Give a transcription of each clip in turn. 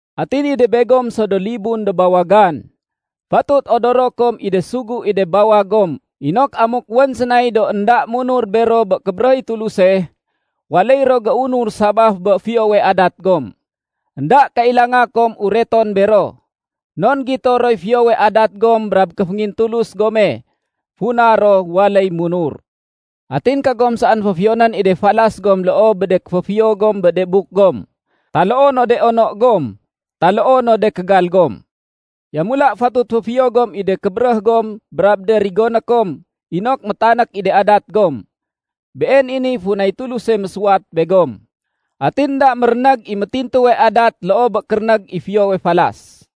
Atin i de begom so do libun do bawagan, fatut odoro kom i de sugu i de bawag gom inok amuk wén sénay do énda munur bero bé kébéréh i Tuluse, waléy ro géunur sabaf bé fiyowe adat gom. Enda kailanga kom ureton bero, non gito roy fiyowe adat gom brab kéféngintulus gome funa ro waléy munur. Atin kagom saén féfiyonén i de falas gom loo bé de kéféfiyo gom bé de buk gom, taloo no de ono gom, taloo no de kégal gom. Yamula fatut féfiyo gom i de kébéréh gom brab de rigoné kom inok métanék i de adat gom. Been i niy funay Tuluse mésuwat begom. Atin énda mérénég i métintuwe adat loo bé kérénég i fiyowe falas.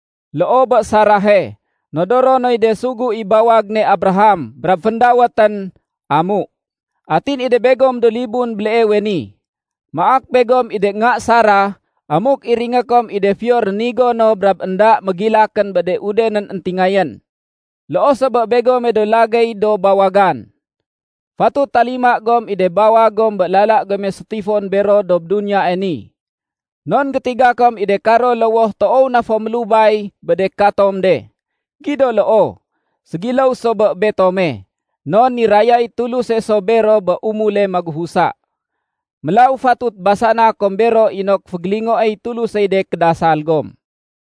Loo bé Sarahe, nodoro noy de sugu i bawag ne Abraham brab féndawétén “Amu”. Atin i de begom do libun béleewe ni, maak begom i de nga Sarah amuk iringé kom i de fiyo rénigo no brab énda mégilakén bé de udenén éntingayén. Loo so bé begome do lagéy do bawagan, fatut talima gom i de bawag gom bé lala gome sétifon bero dob duniyae ni. Non gétiga kom i de karo lowoh toow na fo mélubay bé de katom de. Gido loo, ségiléw so bé betome, non nirayay Tuluse so bero bé umule magufusa. Mélaw fatut basana kom bero inok fégélingoéy Tulusey de kédasal gom.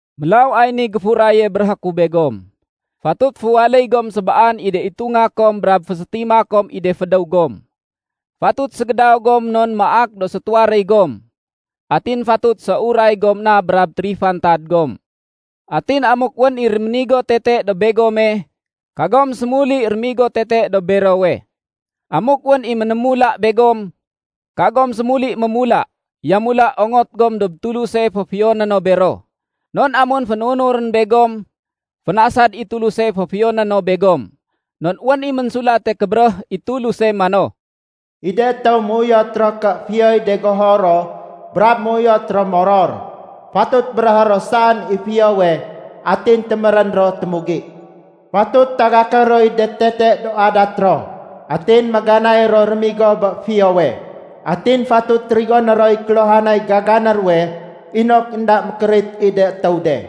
Mélaw ay niy géfuraye béréhé ku begom. Fatut féwaléy gom sébaan i de itunga kom brab fésétima kom i de fédéw gom. Fatut ségédaw gom non maak do sétuwaréy gom. Atin fatut séuray gom na brab térifantad gom. Atin amuk wén i réménigo tete dob begome, kagom sémuli rémigo tete dob berowe. Amuk wén i ménémula begom, kagom sémuli mémula. Yamula ongot gom dob Tuluse féfiyoné no bero. Non amun fénunurén begom, fénasad i Tuluse féfiyoné no begom. Non wén i Ménsulate Kébéréh i Tuluse mano, “I de étéw méuyot ro ké fiyoy de goho ro brab méuyot ro moror, fatut béréhé ro saén i fiyowe atin témérén ro témugi. Fatut tagaké roy de tete do adat ro atin méganay ro rémigo bé fiyowe. Atin fatut rigoné roy kéluhanay gagané ruwe inok énda mékérit i de étéw de.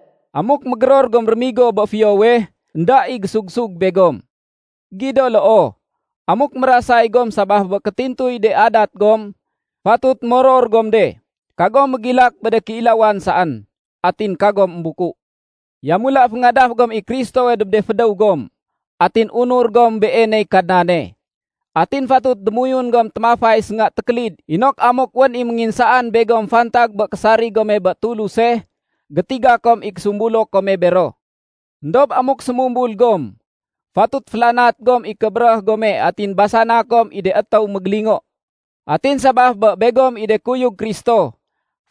Amuk mégéror gom rémigo bé fiyowe, énda i gésug-sug begom. Gido loo, amuk mérasay gom sabaf bé kétintuy de adat gom, fatut moror gom de. Kagom mégilak bé de kéilawan saén. Atin kagom émbuku. Yamula, féngadaf gom i Kristowe dob de fédéw gom, atin unur gom Beeney Kadnane. Atin fatut démoyun gom témafay sénga tékélid inok amuk wén i ménginsaan begom fantag bé késarig gome bé Tuluse, gétiga kom i késumbulo kome bero. Endob amuk sémumbul gom, fatut félanat gom i kébéréh gome atin basana kom i de étéw mégélingo. Atin sabaf bé begom i de kuyug Kristo,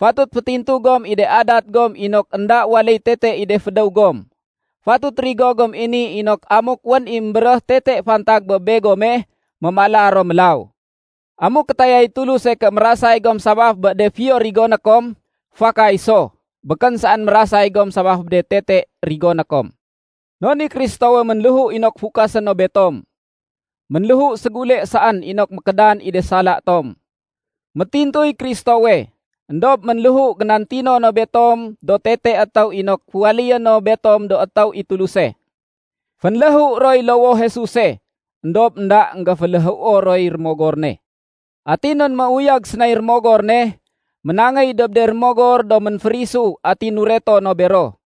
fatut fétintu gom i de adat gom inok énda waléy tete i de fédéw gom. Fatut rigo gom i ni inok amuk wén i émbéréh tete fantag bé begome, mémala ro mélaw. Amuk kétayay Tuluse ké mérasay gom sabaf bé de fiyo rigoné kom, fakay so. Békén saén mérasay gom sabaf bé de tete rigoné kom. Non i Kristowe ménléhu inok fukasé no betom. Ménléhu ségule saén inok mékédan i de sala tom. Métintuy Kristowe, éndob ménléhu génantino no betom do tete étéw inok féwaléyé no betom do étéw i Tuluse. Fénléhu roy lowoh Jesuse, éndob énda énggéféléhuo roy Rémogor ne. Atin non méuyag sénay Rémogor ne, ménangéy dob de rémogor do ménférisu atin nureto no bero.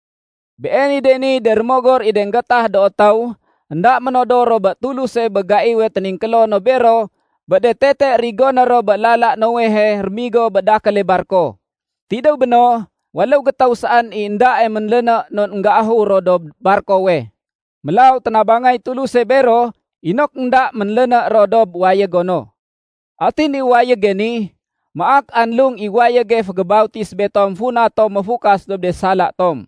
Been i de niy de rémogor i de énggétah do étéw énda ménodor ro bé Tuluse bé gaiwe téningkélo no bero bé de tete rigoné ro bé lala Noehe rémigo bé dakéle barko. Tidéw béno, waléw gétéw saén i éndae ménléné non énggéahur ro dob barkowe. Mélaw ténabangay Tuluse bero inok énda ménléné ro dob wayégo no. Atin i wayége ni, maak anlung i wayége fégébautis betom funa tom méfukas dob de sala tom.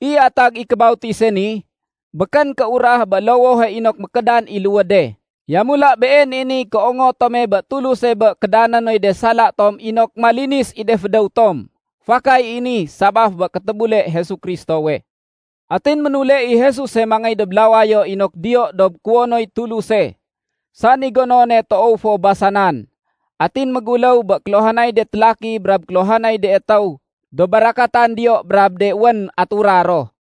I atag i kébautise ni, békén kéurah bé lowohe inok mékédan i luwéde. Yamula been i niy kéongot tome bé Tuluse bé kédané noy de sala tom inok malinis i de fédéw tom. Fakay i ni sabaf bé kétébule Jesu Kristowe. Atin ménule i Jesuse mangéy dob lawayo inok diyo dob kuwonoy Tuluse, sani gonone toow fo basanan, atin méguléw bé kéluhanay de télaki brab kéluhanay de étéw do barakatan diyo brab de wén atura ro.